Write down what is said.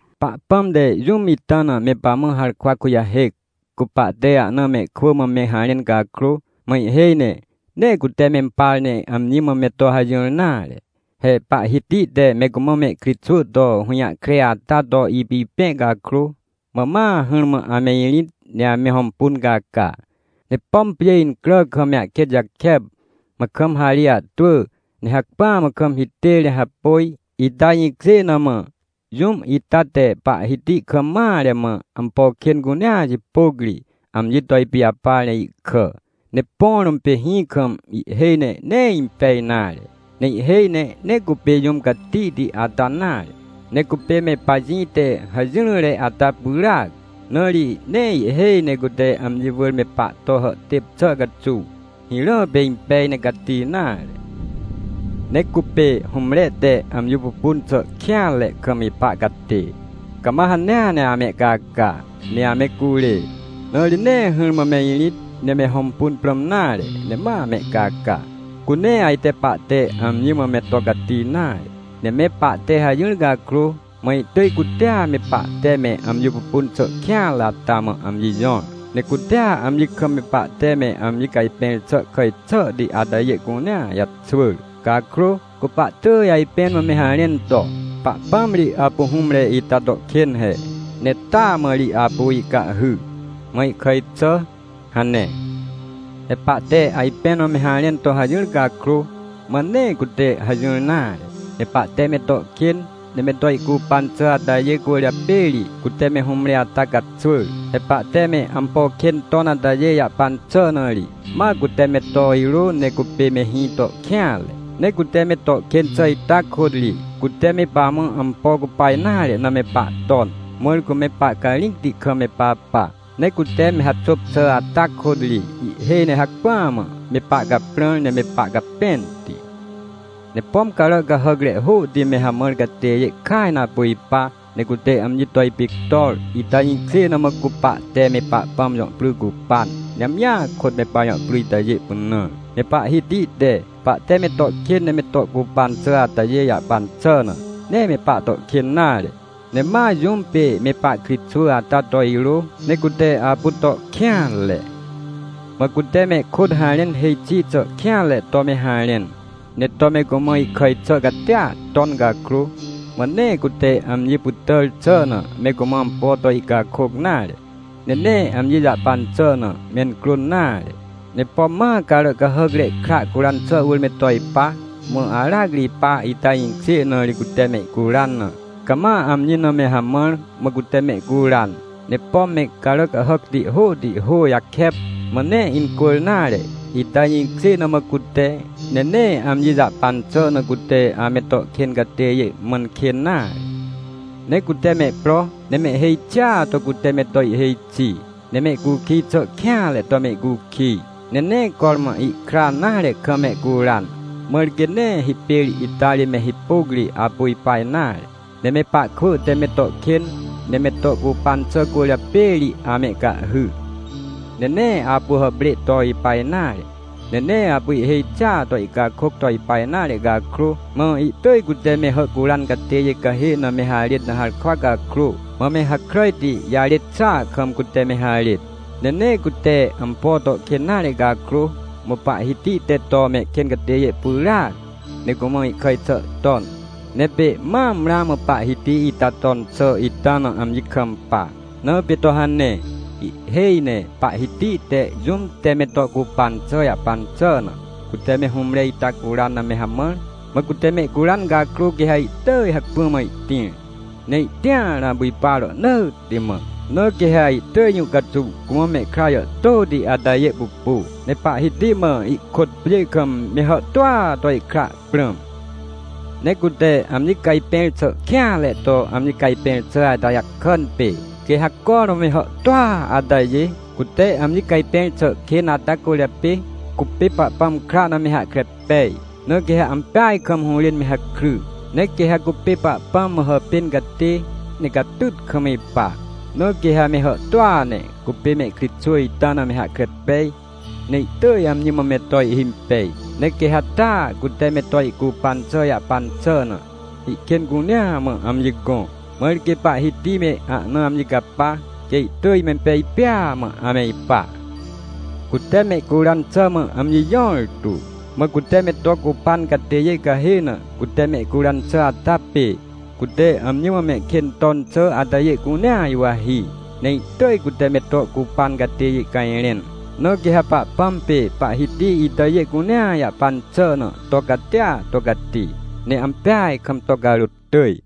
Pahpãm te jũm ita na, me pamã harkwa kujahêc, cu pahte ahna mehkwỳ mã me harẽn cakrô, mã ihhêj ne, nee cute mempar, ne amji mã me to hajỹr nare. He Pahhiti te me cumã mehkritxwỳ to hũjahkre ata to ipipẽ cakrô, mã ma hỹrmã ame irĩt, ne ame hõmpun caca. Ne pom pjê incrà kam me ahkêt jakep, mã kam harê ahtwỳ, ne hacpỹa mã kam hitêr ne hapôj, ita jĩkjê na mã, jũm ita te Pahhiti kam mare mã, ampo kên cunea jipôc ri, amji to ipijapar ne ihkà. Ne põ rũm pê hĩ kam, ihhêj ne nee impej nare. Ne ihhêj ne, nee cupê jũm catihti ata nare, ne cupê me pajĩ te hajỹrỹre ata pyràac. Na ri nee ihhêj ne cute amji wỳr me pahto hàhtêp xà caxuw, hirã pê impej ne cati nare. Ne cupê hũmre te amji pupun xà kêanre kam ipa catê, cama hanea ne amehcaca, ne ame curê. Na ri nee hỹrmã me irĩt, ne me hõmpun prãm nare, ne ma amehcaca. Cu nee ajte pahte amji mã me to cati nare. Ne me pahte hajỹr cakrô, mã ihtỳj cutea me pahte me amji pupun xà kêanre ata mã amji jõr, ne cutea amji kam me pahte me amji cajpẽr xà kàj xàhti atajê cunea jaxwỳr. Cakrô, cu pahtỳj ajpẽn mã me harẽn to: “Pahpãm ri apu hũmre ita to kên he, ne taa mã ri apu ihcahhy, mã ihkàj xà” hane. He pahte ajpẽn mã me harẽn to hajỹr cakrô, mã nee cute hajỹr nare. Ne pahte me to kên, ne me to ihcupan xà atajê cwỳrjapê ri, cute me hũmre ata caxwỳr. He pahte me ampo kên ton atajê jahpan xà na ri, ma cute me to irô, ne cupê me hĩ to kêanre. Ne cute me to kên xà ita kôt ri, cute me pamã ampo cupa nare na me pahton, mãr cu me pahcarĩcti kam me papa. Ne cute me haxôp xà ata kôt ri, ihhêj ne hacpỹa mã, me pahcaprãr, ne me pahcapẽnti. Ne pom carà cahàcre hôhti me hamãr catêjê kaj na apu ipa, ne cute amji to ipictor, ita jĩkjê na mã, cu pahte me Pahpãm jõ pry cupan, ne amjia kôt me pajõ pry itajê pynãr. Ne Pahhiti te, pahte me to kên ne me to ihcupan xà atajê jahpan xà na, nee me pahto kên nare, ne ma jũm pê me pahkritxwỳ ata to irô, ne cute apu to kêanre. Mã cute mehkôt harẽn hêj xi xà kêanre to me harẽn, ne to me cumã ihkàj xà catia ton cakrô, mã nee cute amji pytàr xà na me cumã ampo to ihcakôc nare, ne nee amji jahpan xà na mencrôn nare. Ne pom ma carà cahàcre kra curan xà wỳr me to ipa, mã aracri ipa, ita jĩkjê na ri cute mehcuran na, cama amji na me hamãr, mã cute mehcuran. Ne pom me carà cahàcti hôhti hô jakep, mã nee incwỳr nare, ita jĩkjê na mã cute, ne nee amji jahpan xà na cute ame to kên catêjê mãn kên nare. Ne cute mehpro, ne mehhêj xia to cute me to ihhêj xi, ne mehcukij xà kêanre to mehcukij, ne nee cormã ihkra nare kam mehcuran, mãr quê nee hipêr ita ri me hipôc ri apu ipa nare. Ne me pahkwỳ te me to kên, ne me to ihcupan xà cwỳrjapê ri amehcahhy. Ne nee apu hàprê to ipa nare, ne nee apu ihhêj xia to ihcakôc to ipa nare cakrô, mã ihtỳj cute me hàhcuran catêjê cahê na me harêt na harkwa cakrô, mã me hakràjti jarêt xàa kam, cute me harêt. Ne nee cute ampo to kên nare cakrô, mã Pahhiti te to mehkên catêjê pyràac, ne cumã ihkàj xà ton. Ne pê mam ramã Pahhiti ita ton xà ita na amji kampa, na pê to hane. Ihhêj ne Pahhiti te, jũm te me to ihcupan xà jahpan xà na, cute me hũmre ita curan na me hamãr, mã cute mehcuran cakrô, quê ha ihtỳj hacpỹa mã ihtĩr, ne ihtĩar na apu ipa rohnỳtti mã. Na quê ha ihtỳj jũ caxuw cumã mehkra jàhtôti atajê pupu, ne Pahhiti mã ihkôt pjê kam me hàhtôa to ihkra prãm. Ne cute amji cajpẽr xà kêanre to amji cajpẽr xà ata jakàn pê, quê ha cormã me hàhtôa atajê, cute amji cajpẽr xà kên ata cwỳrjapê cupê Pahpãm kra na me hahkre pej, na quê ha ampeaj kam hũrên me hakry. Ne quê ha cupê Pahpãm mã hàpên catê, ne catyt kam ipa. Na quê ha me hàhtôa ne, cupê mehkritxwỳ ita na me hahkre pej, ne ihtỳj amji mã me to ihhimpej. Ne quê ha taa, cute me to ihcupan xà jahpan xà na, ihkên cunea mã amji gõ, mãr quê Pahhiti me ahna amji capa, quê ihtỳj mempej pêa mã ame ipa. Cute mehcuran xà mã amji jõrtu. Mã cute me to ihcupan catêjê cahê na cute mehcuran xà ata pê, cute amji mã mehkên ton xà atajê cunea juwahi, ne ihtỳj cute me to ih cupan catêjê cajrẽn. Na quê ha Pahpãm pê Pahhiti itajê cunea jahpan xà na to catia to cati, ne ampeaj kam to carôt tỳj.